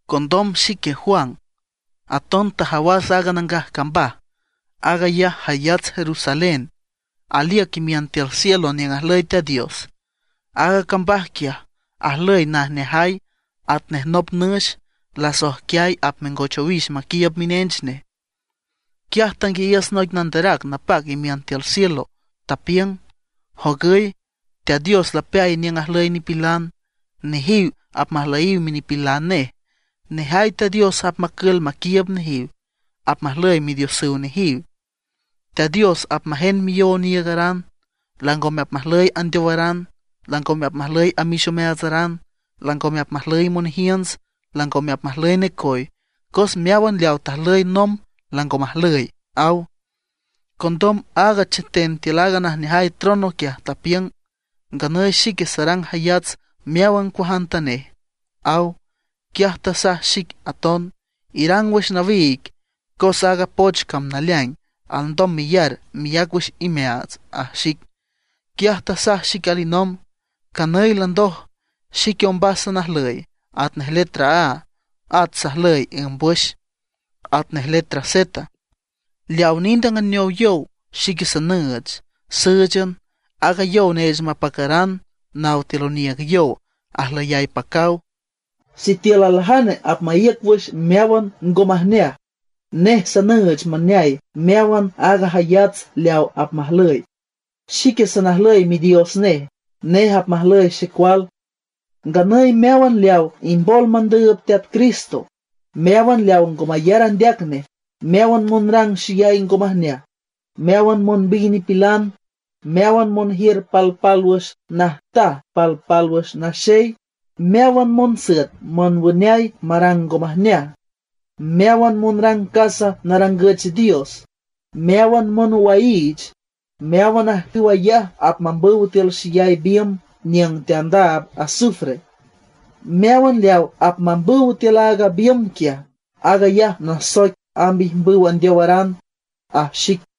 Condom xique Juan, aton tajawas aaga nangaj cambaj, aag ayaj jayats Jerusalén aliüc imiün tiül cielo niüng ajlüy Teat Dios. Aaga cambaj quiaj ajlüy najneajay atnej nop nüx lasoijquiay apmengoch owix maquiiüb minench nej. Quiaj tanguiayiüs noic nanderac napac imiün tiül cielo, tapiüng: ―Jogüy, Teat Dios lapeay niüng ajlüy nipilan. Nejiw apmajlüyiw minipilan nej, nejay Teat Dios apmacül maquiiüb nejiw, apmajlüy Midiosüw nejiw. Teat Dios apmajend miyow oniiügaran. Langome apmajlüy andeowaran; langome apmajlüy amix omeaatsaran, langome apmajlüy monjiünts, langome apmajlüy necoy, cos meáwan leawa tajlüy nomb lango majlüy ―aw. Condom aaga cheten tiül aaga najneajay trono quiaj, tapiüng: ―Nganüy xique sarang jayats meáwan cuajantanej ―aw. Quiaj tasaj xic aton: ―Irang wüx nawiig, cos aaga poch cam naleaing, alndom meyar meyac wüx imeaats ―aj xic. Quiaj tasaj xic alinomb: ―Canüy landoj. Xique ombas salnajlüy, atnej letra A; at sajlüy ǘmbwüx, atnej letra Z. Leawa nind anganeow yow xique sanüüch, sǘüchan aaga yow neech mapacaran naw tiül oniiüg yow ajlüyay pacaw. Sitiül aljane apmaíüc wüx meáwan ngo majneaj, nej sanüüch maneay meáwan aaga jayats leaw apmajlüy. Xique sanajlüy Midios nej, nej apmajlüy xecual. Nganüy meáwan leaw imbol mandüüb Teat Cristo, meáwan leawa ngo mayar andeac nej, meáwan monrang xeyay ngo majneaj, meáwan monbiy nipilan, meáwan monjiür palpálwüx najtaj palpálwüx naxey, meáwan monsüet monwüneay marang ngo majneaj, meáwan monrang casa narangüch dios, meáwan monwaiich, meáwan ajcüw ayaj apmambüw tiül xeyay biümb niüng teandaab azufre. Meáwan leawa apmambüw tiül aaga biümb quiaj, aag ayaj nasoic amb ijmbüw andeowaran ―aj xic.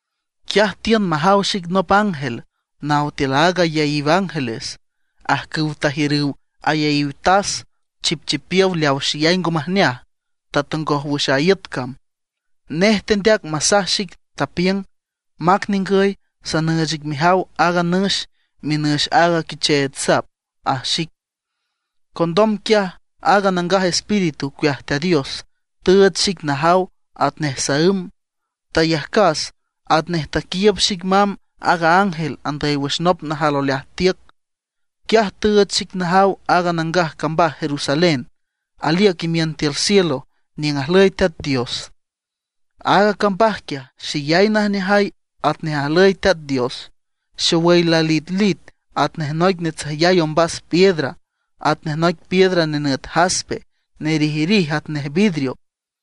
Quiaj tiün majaw xic nop ángel naw tiül aaga ayaíw ángeles, ajcüw tajiürüw ayaíw tas chipchipiow leaw xeyay ngo majneaj tatongoj wüx a iüt cam. Nej tendeac masaj xic, tapiüng: ―Mac ningüy, sanüüch ic mejaw aaga nüx, minüx aaga Quicheech Sap ―aj xic. Condom quiaj aaga Nangaj Espíritu ocueaj Teat Dios tüüch xic najaw atnej saǘm. Tayajcas atnej taquiiüb xic mamb aaga ángel andüy wüx nop najal oleaj tiüc. Quiaj tüüch xic najaw aaga nangaj cambaj Jerusalén aliüc imiün tiül cielo niüng ajlüy Teat Dios. Aaga cambaj quiaj, xeyay najneajay atnej ajlüy Teat Dios. Xowüy lalitlit atnej noic natsüjyay ombas piedra, atnej noic piedra nenüt jaspe, nerijrij atnej vidrio.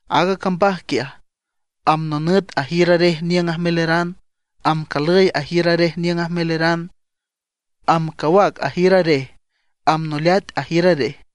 Aaga cambaj quiaj amb nonüt ajiür arej niüng ajmeleran; amb calüy ajiür arej niüng ajmeleran; amb cawac ajiür arej; amb noleat ajiür arej.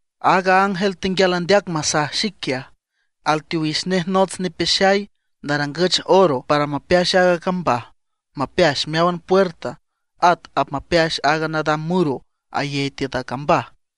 Aaga ángel tenguial andeac masaj xic quiaj, alteowix nej nots nipeaxay narangüch oro para mapeax aaga cambaj, mapeax meáwan puerta, at apmapeax aaga nadam muro ayey tiüt a cambaj.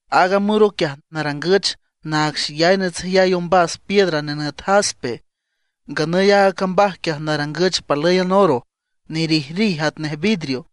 Aaga muro quiaj, narangüch naag xeyay natsüjyay ombas piedra nenüt jaspe. Nganüy aaga cambaj quiaj narangüch palǘyan oro nerijrij atnej vidrio.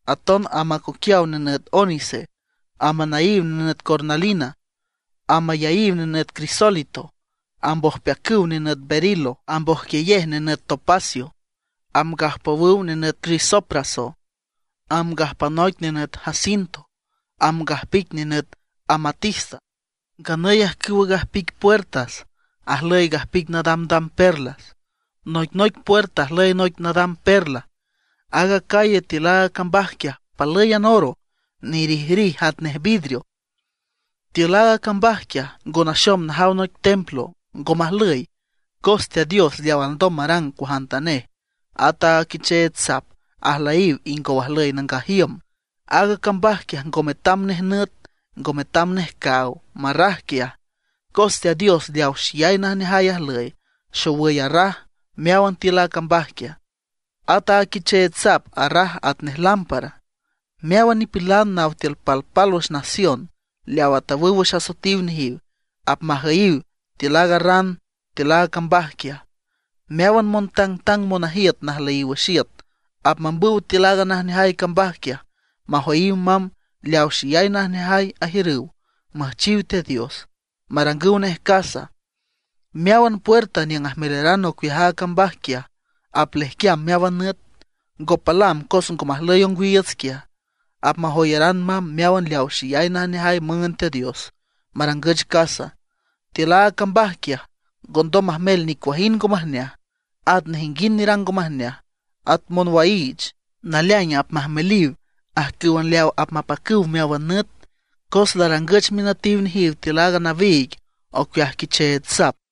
Aton amb acoquiaw nenüt ónice, amb anaíw nenüt cornalina, amb ayaíw nenüt crisólito, amb ojpeacüw nenüt berilo, amb ojquiyej nenüt topacio, amb gajpowüw nenüt crisopraso, amb gajpanoic nenüt jacinto, amb gajpic nenüt amatista. Nganüy ajcüwa gajpic puerta ajlüy gajpic nadamdam perla, noicnoic puerta ajlüy noic nadam perla. Aaga calle tiül aaga cambaj quiaj palǘyan oro, nerijrij atnej vidrio. Tiül aaga cambaj quiaj, ngo naxom najaw noic templo; ngo majlüy, cos Teat Dios leaw alndom marang cuajantanej, at aaga Quicheech Sap ajlüyiw ingow ajlüy nangaj iüm. Aaga cambaj quiaj ngo metam nej nüt, ngo metam nej caaw marraj quiaj, cos Teat Dios leaw xeyay najneajay ajlüy, xowüy arraj meáwan tiül a cambaj quiaj. At aaga Quicheech Sap arraj atnej lámpara. Meáwan nipilan naw tiül palpálwüx nación leawa tawüw wüx asoetiw nejiw apmajüyiw tiül aaga ran tiül aaga cambaj quiaj. Meáwan montangtang monajiüt najlüyiw wüx iüt apmambüw tiül aaga najneajay cambaj quiaj, majoyiw mamb leawa xeyay najneajay ajiürüw müjchiw Teat Dios, marangüw nej casa. Meáwan puerta niüng ajmeleran ocueaj aaga cambaj quiaj aplejquiam meáwan nüt, ngo palam cos ngo majlüy ongwiiüts quiaj. Apmajoyaran mamb meáwan leaw xeyay najneajay müünd Teat Dios marangüch casa. Tiül aaga cambaj quiaj, ngondom majmel nicuajind ngo majneaj, at nejinguind nerang ngo majneaj, at monwaiich; naleaing apmajmeliw ajcǘwan leawa apmapacüw meáwan nüt, cos larangüch minütiw nejiw tiül aaga nawiig ocueaj Quicheech Sap.